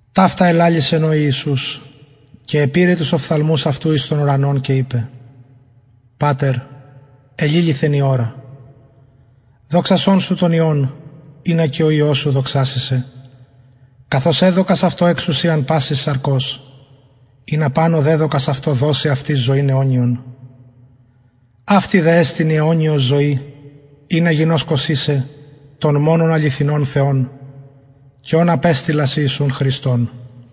ταυτα ελαλησεν ο ιησους και επηρεν τους οφθαλμους αυτου εις τον ουρανον και ειπεν πατερ εληλυθεν η ωρα δοξασον σου τον υιον ινα και ο υιος σου δοξαση σε καθως εδωκας αυτω εξουσιαν πασης σαρκος ινα παν ο δεδωκας αυτω δωσει αυτοις ζωην αιωνιον αυτη δε εστιν η αιωνιος ζωη ινα γινωσκωσιν σε τον μονον αληθινον θεον και ον απεστειλας ιησουν χριστον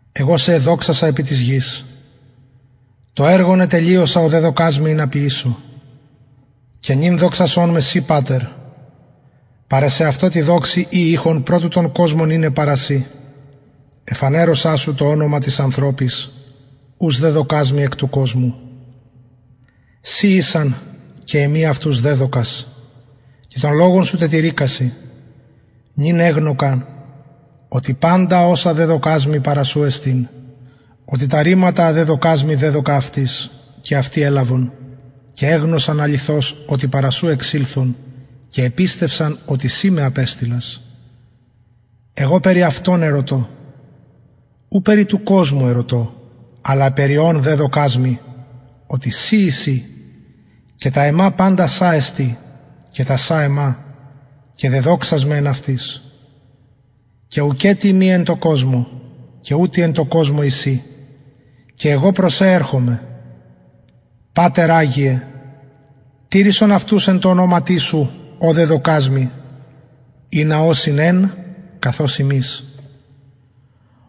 εγω σε εδοξασα επι της γης το εργον ετελειωσα ο δεδωκας μοι ινα ποιησω και νυν δοξασον με συ πατερ παρα σεαυτω τη δοξη η ειχον προ του τον κοσμον ειναι παρα σοι εφανερωσα σου το ονομα τοις ανθρωποις ους δεδωκας μοι εκ του κοσμου σοι ησαν και εμοι αυτους δεδωκας και τον λογον σου τετηρηκασιν νυν εγνωκαν οτι παντα οσα δεδωκας μοι παρα σου εστιν οτι τα ρηματα α δεδωκας μοι δεδωκα αυτοις και αυτοι ελαβον και εγνωσαν αληθως οτι παρα σου εξηλθον και επιστευσαν οτι συ με απεστειλας εγω περι αυτων ερωτω ου περι του κοσμου ερωτω αλλα περι ων δεδωκας μοι οτι σοι εισιν και τα εμα παντα σα εστιν και τα σα εμα και δεδοξασμαι εν αυτοις και ουκετι ειμι εν τω κοσμω και ουτοι εν τω κοσμω εισιν και εγω προς σε ερχομαι πατερ αγιε τηρησον αυτους εν τω ονοματι σου ω δεδωκας μοι ινα ωσιν εν καθως ημεις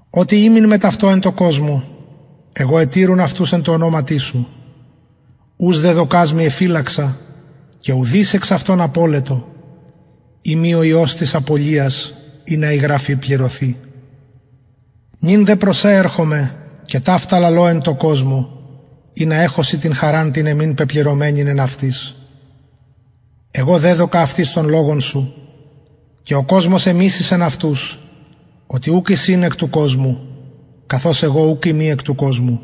οτε ημην μετ αυτων εν τω κοσμω εγω ετηρουν αυτους εν τω ονοματι σου ους δεδωκας μοι εφυλαξα και ουδεις εξ αυτων απωλετο ει μη ο υιος της απωλειας ινα η γραφη πληρωθη νυν δε προς σε ερχομαι και ταυτα λαλω εν τω κοσμω ινα εχωσιν την χαραν την εμην πεπληρωμενην εν αυτοις εγω δεδωκα αυτοις τον λογον σου και ο κοσμος εμισησεν αυτους οτι ουκ εισιν εκ του κοσμου καθως εγω ουκ ειμι εκ του κοσμου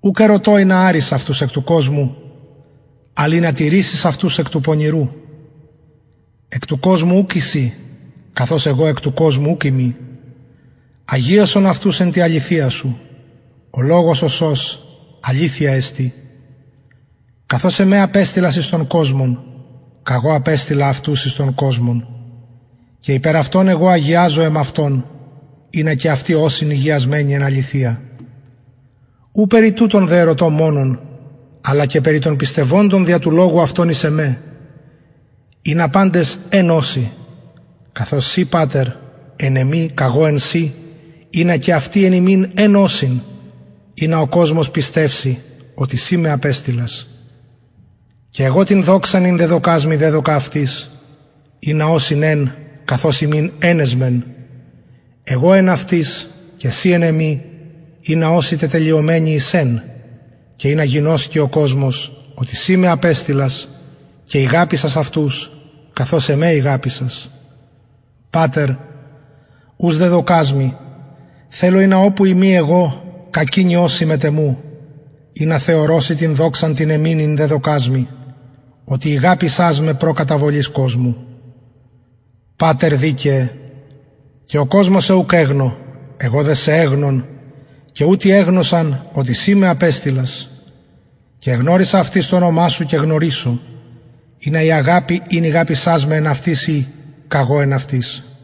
ουκ ερωτω ινα αρης αυτους εκ του κοσμου αλλ ινα τηρησης αυτους εκ του πονηρου εκ του κοσμου ουκ εισιν καθως εγω εκ του κοσμου ουκ ειμι αγιασον αυτους εν τη αληθεια σου ο λογος ο σος αληθεια εστιν καθως εμε απεστειλας εις τον κοσμον καγω απεστειλα αυτους εις τον κοσμον και υπερ αυτων εγω αγιαζω εμαυτον ινα και αυτοι ωσιν ηγιασμενοι εν αληθεια ου περι τουτων δε ερωτω μονον αλλα και περι των πιστευοντων δια του λογου αυτων εις εμε ινα παντες εν ωσιν καθως συ πατερ εν εμοι καγω εν σοι ινα και αυτοι εν ημιν εν ωσιν ινα ο κοσμος πιστευση οτι συ με απεστειλας και εγω την δοξαν ην δεδωκας μοι δεδωκα αυτοις ινα ωσιν εν καθως ημεις εν εσμεν εγω εν αυτοις και συ εν εμοι ινα ωσιν τετελειωμενοι εις εν και ινα γινωσκη ο κοσμος οτι συ με απεστειλας και ηγαπησας αυτους καθως εμε ηγαπησας πατερ ους δεδωκας μοι θελω ινα οπου ειμι εγω κακεινοι ωσιν μετ εμου ινα θεωρωσιν την δοξαν την εμην ην εδωκας μοι οτι ηγαπησας με προ καταβολης κοσμου πατερ δικαιε και ο κοσμος σε ουκ εγνω εγω δε σε εγνων και ουτοι εγνωσαν οτι συ με απεστειλας και εγνωρισα αυτοις το ονομα σου και γνωρισω ινα η αγαπη ην ηγαπησας με εν αυτοις η καγω εν αυτοις